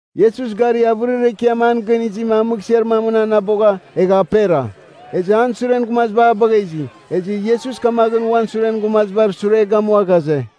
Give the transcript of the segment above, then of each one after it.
Iesus gari avɨrir ekiam an gɨn izima a mɨghsɨar mamɨn anabogha, egha apera. Ezɨ an suren gumaziba a bagha izi. Ezɨ Iesus kamaghɨn uan suren gumazibar sure gamua ghaze,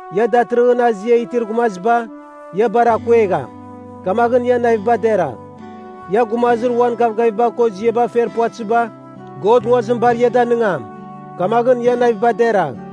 Ia datɨrɨghɨn azia itir gumaziba, ia bar akuegham. Kamaghɨn ian naviba deragh. Ia gumazir uan gavgaviba ko ziaba fer puvatɨziba, God nguazim bar ia danɨngam. Kamaghɨn ian naviba deragh.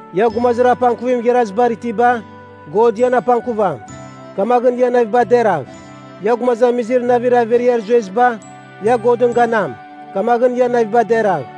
Ia gumazir apangkuvim igharazibar itiba, God ian apangkuvam. Kamaghɨn ian naviba deragh. Ia gumazamizir navir averiar zueziba, ia Godɨn ganam. Kamaghɨn ian naviba deragh.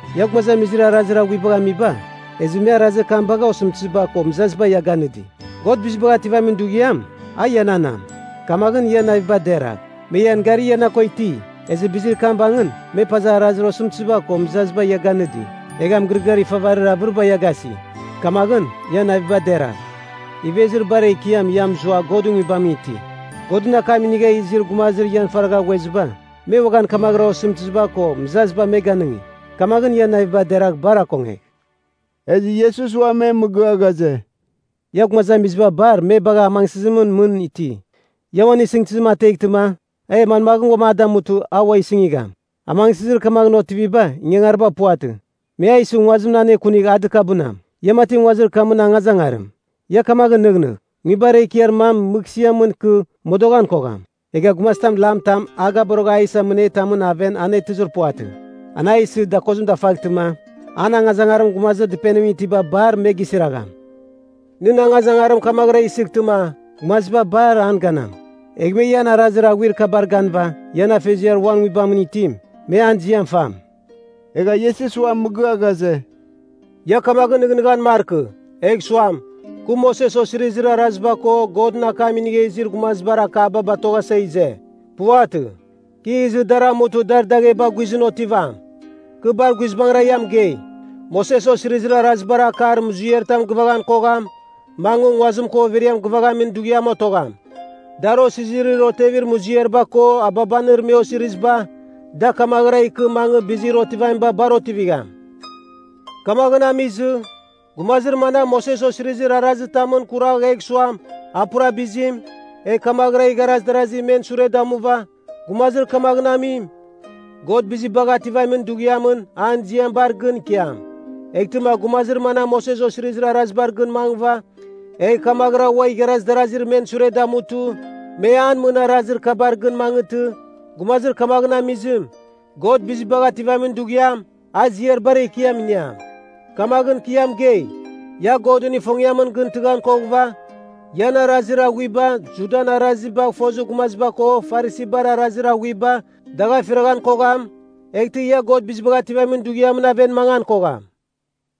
Ia gumazamizir arazir aghuibagh amiba, ezɨ me arazir kam bagha osɨmtɨziba ko mɨzaziba ia ganɨdi, God Bizibagh Ativamin Dughiam, a iananam. Kamaghɨn ian naviba deragh. Me ian gari ia na ko iti, ezɨ bizir kam bangɨn me paza arazir osɨmtɨziba ko mɨzaziba ia ganɨdi, egha mɨgɨrɨgɨar ifavarir avɨriba ia gasi, kamaghɨn ian naviba deragh. Ivezir bar ekiam ia mɨzua Godɨn Nguibamɨn iti. Godɨn akam inigha izir gumazir ian faragha ghueziba, me uaghan kamaghɨra osɨmtɨziba ko mɨzaziba me ganɨngi. Kamaghɨn ia naviba deragh bar akongegh.” Ezɨ Iesus ua me mɨgɨa ghaze, “Ia gumazamiziba bar me bagha, amangsɨzimɨn mɨn iti. Ia uan isɨngtɨzim ateghtɨma e manmaghɨn a damutɨ a ua sɨngigham? Amangsɨzir kamaghɨn otiviba ingangariba puvatɨ. Me a isɨ nguazimɨn anekunigh a dɨkabɨnam. Ia mati nguazir kamɨn angazangarim. Ia kamagh nɨghnɨgh! Nguibar ekiar mam mɨghsɨamɨn ikɨ modoghan kogham. Egha gumazitam lam tam a gaborogha a isa mɨnetamɨn aven anetɨzir puvatɨ. An a isɨ dakozim dafaghtɨma, an angazangarim gumazir dɨpenimɨn itiba bar me gisiragham. Nɨn angazangarim kamaghɨra isɨghtɨma, gumaziba bar an ganam. Egh me ian arazir aghuir kabar ganɨva ian Afeziar uan Nguibamɨn itim, me an ziam fam.” Egha Iesus ua mɨgɨa ghaze, “Ia kamaghɨn nɨghnɨghan markɨ, egh suam, kɨ Moses Osirizir Araziba ko Godɨn akam inigha izir gumazibar akaba batoghasa ize. Puvatɨ. Kɨ izɨ dar amutɨ dar dagheba guizɨn otivam. Kɨ bar guizbangɨra ia mɨgei, Moses Osirizir Arazibar akar muziaritam gɨvaghan kogham, mangɨ nguazim ko overiam gɨvaghamin dughiam otogham. Dar osizirir otevir muziariba ko ababanir me osiriziba, da kamaghɨra ikɨ mangɨ bizir otivamiba bar otivigham. Kamaghɨn amizɨ, gumazir manam Moses Osirizir Arazitamɨn kuragh egh suam, a pura bizim, egh kamaghɨra igharaz darazi men sure damuva, gumazir kamaghɨn amim, God Bizibagh Ativamin Dughiamɨn an ziam bar gɨn ikiam. Eghtɨma gumazir manam Moses Osirizir Arazibar gɨn mangɨva egh kamaghɨra ua igharaz darazir men sure damutɨ me an mɨn arazir kabar gɨn mangɨtɨ, gumazir kamaghɨn amizim, God Bizibagh Ativamin Dughiam, a ziar bar ekiam iniam. Kamaghɨn kɨ ia mɨgei, ia Godɨn ifongiamɨn gɨn tɨghan koghɨva ian arazir aghuiba Judan arazibagh fozir gumaziba ko Farisibar arazir aghuiba dagh afiraghan kogham, eghtɨ ia God Bizibagh Ativamin Dughiamɨn aven mangan kogham.”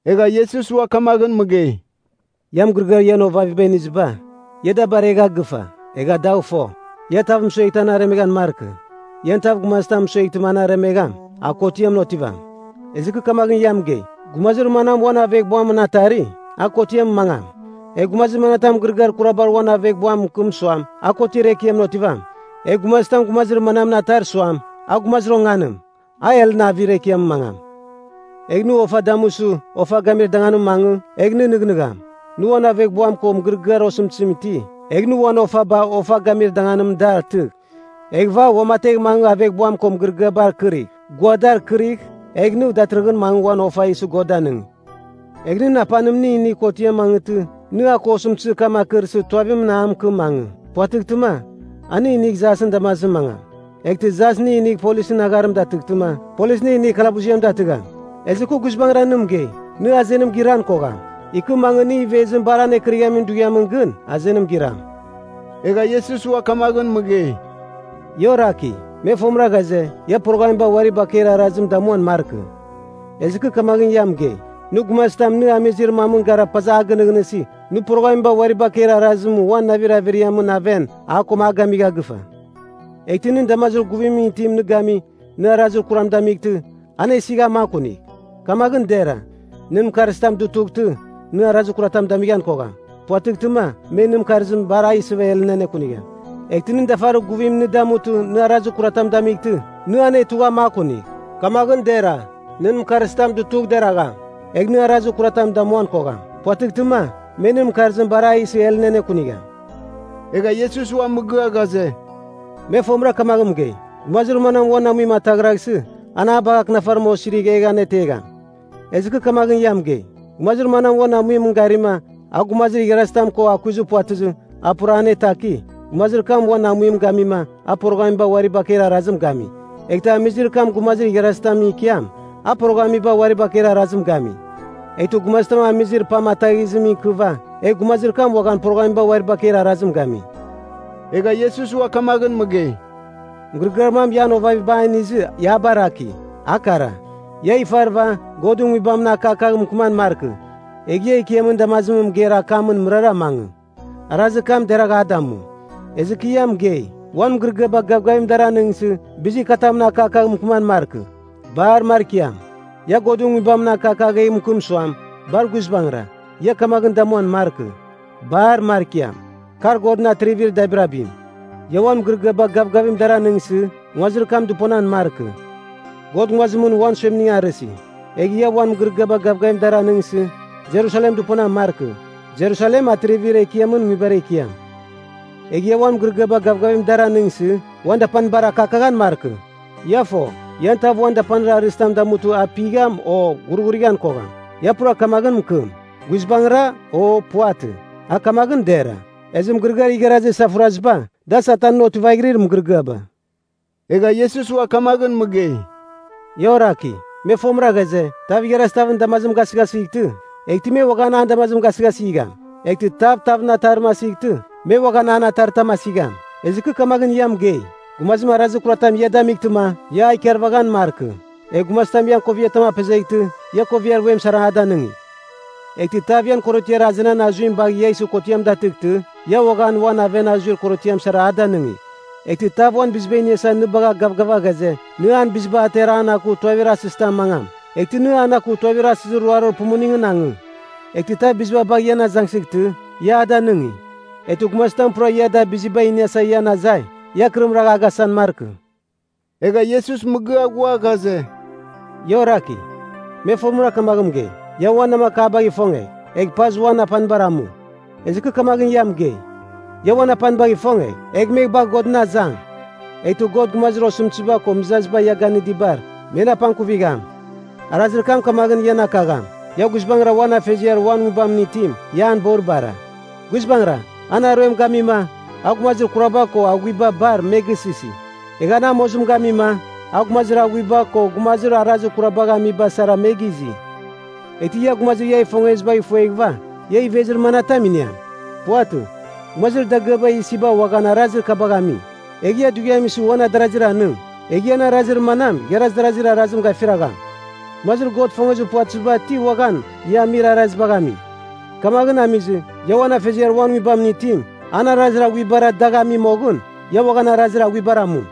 Egha Iesus ua kamaghɨn mɨgei, “Ia mɨgɨrɨgɨar ian ovaviba iniziba, ia da baregha gɨfa egha dagh fo, ia tav mɨsueghtɨma an aremeghan markɨ. Ian tav gumazitam mɨsueghtɨma an aremegham, a kotiamɨn otivam. Ezɨ kɨ kamaghɨn ia mɨgei, gumazir manam uan aveghbuamɨn atari, a kotiamɨn mangam. Egh gumazitam mɨgɨrɨgɨar kurabar uan aveghbuam mɨkɨm suam, a Kotiar Ekiamɨn otivam. Egh gumazitam gumazir mamɨn atar suam, a gumazir onganim, a helɨn avir ekiamɨn mangam. “Egh nɨ ofa damusɨ ofa gamir danganimɨn mangɨ, egh nɨ nɨghnɨgham, nɨ uan aveghbuam ko mɨgɨrɨgɨar osɨmtɨzim iti, egh nɨ uan ofaba ofa gamir danganimɨn dar atɨgh. Eghɨva uamategh mangɨ aveghbuam ko mɨgɨrɨgɨabar kɨrigh. Gua dar kɨrigh, egh nɨ datɨrɨghɨn mangɨ uan ofa isɨ God danɨng. “Egh nɨn apanim nɨ inigh kotiamɨn mangɨtɨ, nɨ a ko osɨmtɨzir kam akɨrsɨ tuavimɨn a mɨkɨm mangɨ. Puvatɨghtɨma, a nɨ inigh jasɨn damazimɨn mangam. Eghtɨ jas nɨ inigh polisɨn agharim datɨghtɨma, polis nɨ inigh kalabuziam datɨgham. Ezɨ kɨ guizbangɨra nɨ mɨgei, nɨ azenim giran kogham, ikɨ mangɨ nɨ ivezim bar anekɨrighamin dughiamɨn gɨn, azenim giram.” Egha Iesus ua kamaghɨn mɨgei, “Ia oraki, me fomɨra ghaze, ia poroghamiba uari bakeir arazim, damuan markɨ. Ezɨ kɨ kamaghɨn ia mɨgei, nɨ gumazitam nɨ amizir mamɨn gara paza a gɨnɨghnɨsi, nɨ poroghamiba uari bakeir arazim uan navir averiamɨn aven, a ko a gamigha gɨfa. “Eghtɨ nɨn damazir guvimɨn itim nɨ gami, nɨ arazir kuram damightɨ, anesigh a makunigh. Kamaghɨn dera, nɨn mɨkarzitam dutughtɨ, nɨ arazir kuratam damighan kogham. Puvatɨghtɨma, me nɨn mɨkarzim bar a isɨva helɨn anekunigham. Eghtɨ nɨn dafarir guvim nɨ damutɨ nɨ arazir kuratam damightɨ, nɨ anetugh a makunigh. Kamaghɨn dera, nɨn mɨkarzitam dutugh deragham, egh nɨ arazir kuratam damuan kogham. Puvatɨghtɨma, me nɨn mɨkarzim bar a isɨ helɨn anekunigham.” Egha Iesus ua mɨgɨa ghaze, “Me fomɨra kamaghɨn mɨgei, ‘Gumazir manam uan amuim ataghraghsɨ, an a bagh akɨnafarim osirigh egh anetegham.’ Ezɨ kɨ kamaghɨn ia mɨgei, Gumazir manam uan amuimɨn garima, a gumazir igharazitam ko akuiz puvatɨzɨ a pura anetaki, gumazir kam uan amuim gamima a poroghamiba uari bakeir arazim gami. Eghtɨ amizir kam gumazir igharazitamɨn ikiam, a poroghamiba uari bakeir arazim gami. Eghtɨ gumazitam amizir pam ataghizimɨn ikɨva, egh gumazir kam uaghan poroghamiba uari bakeir arazim gami.” Egha Iesus ua kamaghɨn mɨgei, “Mɨgɨrɨgɨar mam ian ovaviba a inizɨ ia a baraki, a kara. ‘Ia ifarɨva Godɨn Nguibamɨn akakagh mɨkɨman markɨ. Egh ia Ekiamɨn damazimɨn mɨgeir akamɨn mɨrara mangɨ, arazir kam deragh a damu.’ Ezɨ kɨ ia mɨgei, uan mɨgɨrɨgɨaba gavgavim dar anɨngsɨ, bizir katamɨn akakagh mɨkɨman markɨ. Bar markiam. Ia Godɨn Nguibam akakagh egh mɨkɨm suam, ‘Bar guizbangɨra,’ ia kamaghɨn damuan markɨ. Bar markiam. Kar Godɨn Atrivir Dabirabim. Ia uan mɨgɨrɨgɨaba gavgavim dar anɨngsɨ, nguazir kam dɨponan markɨ. God nguazimɨn uan suemning arɨsi. Egh ia uan mɨgɨrɨgɨaba gavgavim dar anɨngsɨ, Jerusalem dɨponan markɨ. Jerusalem Atrivir Ekiamɨn nguibar ekiam. Egh ia uan mɨgɨrɨgɨaba gavgavim dar anɨngsɨ uan dapanibar akakaghan markɨ. Ia fo, ian tav uan dapanir arɨzitam damutɨ a pigham, o ghurghurighan kogham. Ia pura kamaghɨn mɨkɨm, ‘Guizbangɨra’ o ‘Puvatɨ.’ A kamaghɨn dera. Ezɨ mɨgɨrɨgɨar igharazir isafuraziba, da Satanɨn otivaghirir mɨgɨrɨgɨaba.” Egha Iesus ua kamaghɨn mɨgei, “Ia oraki, me fomɨra ghaze, ‘Tav igharaz tavɨn damazim a gasɨghasightɨ, eghtɨ me uaghan an damazim gasɨghasigham. Eghtɨ tav tavɨn ataritam asightɨ, me uaghan an ataritam asigham.’ Ezɨ kɨ kamaghɨn ia mɨgei, gumazim arazir kuratam ia damightɨma, ia a ikarvaghan markɨ. Egh gumazitam ian koviatam apezeghtɨ, ia koviar vuem sara a danɨngigh. Eghtɨ tav ian korotiar azenan azuim bagh ia isɨ kotiam datɨghtɨ, ia uaghan uan aven azuir korotiam sara a danɨngigh. Eghtɨ tav uan biziba iniasa nɨ bagha gavgava ghaze, nɨ an biziba atera an aku tuavir asɨzitamɨn mangam, eghtɨ nɨ an aku tuavir asɨzir ruarir pumuningɨn angɨ. Eghtɨ tav biziba bagh ian azangsɨghtɨ, ia a danɨngi. Eghtɨ gumazitam pura ia da biziba iniasa ian azai, ia akɨrim ragh a gasan markɨ.” Egha Iesus mɨgɨa ghua ghaze, “Ia oraki, me fomɨra kamaghɨn mɨgei, ‘Ia uan namakabagh ifongegh, egh pazɨ uan apanibar amu.’ Ezɨ kɨ kamagh ia mɨgei, ia uan apanibagh ifongegh, egh me bagh Godɨn azang, eghtɨ God gumazir osɨmtɨziba ko mɨzaziba ia ganɨdibar, men apangkuvigham. Arazir kam kamaghɨn ian akagham, ia guizbangɨra uan Afeziar uan Nguibamɨn itim, ia an boribara. Guizbangɨra, an aruem gamima, a gumazir kuraba ko aghuiba bar me gisɨsi. Egha an amozim gamima, a gumazir aghuiba ko gumazir arazir kurabagh amiba sara me gizi. Eghtɨ ia gumazir ia ifongezibagh ifueghɨva ia ivezir manatam iniam? Puvatɨ. Gumazir dagɨaba isiba uaghan arazir kabagh ami. Egh ia dughiam isɨ uan adarazira anɨng, egh ian arazir manam igharaz darazir arazim gafiragham? Gumazir God gɨfozir puvatɨziba ti uaghan ia amir arazibagh ami! Kamaghɨn amizɨ, ia uan Afeziar uan Nguibamɨn itim, an arazir aghuibara dagh ami moghɨn, ia uaghan arazir aghuibar amu.”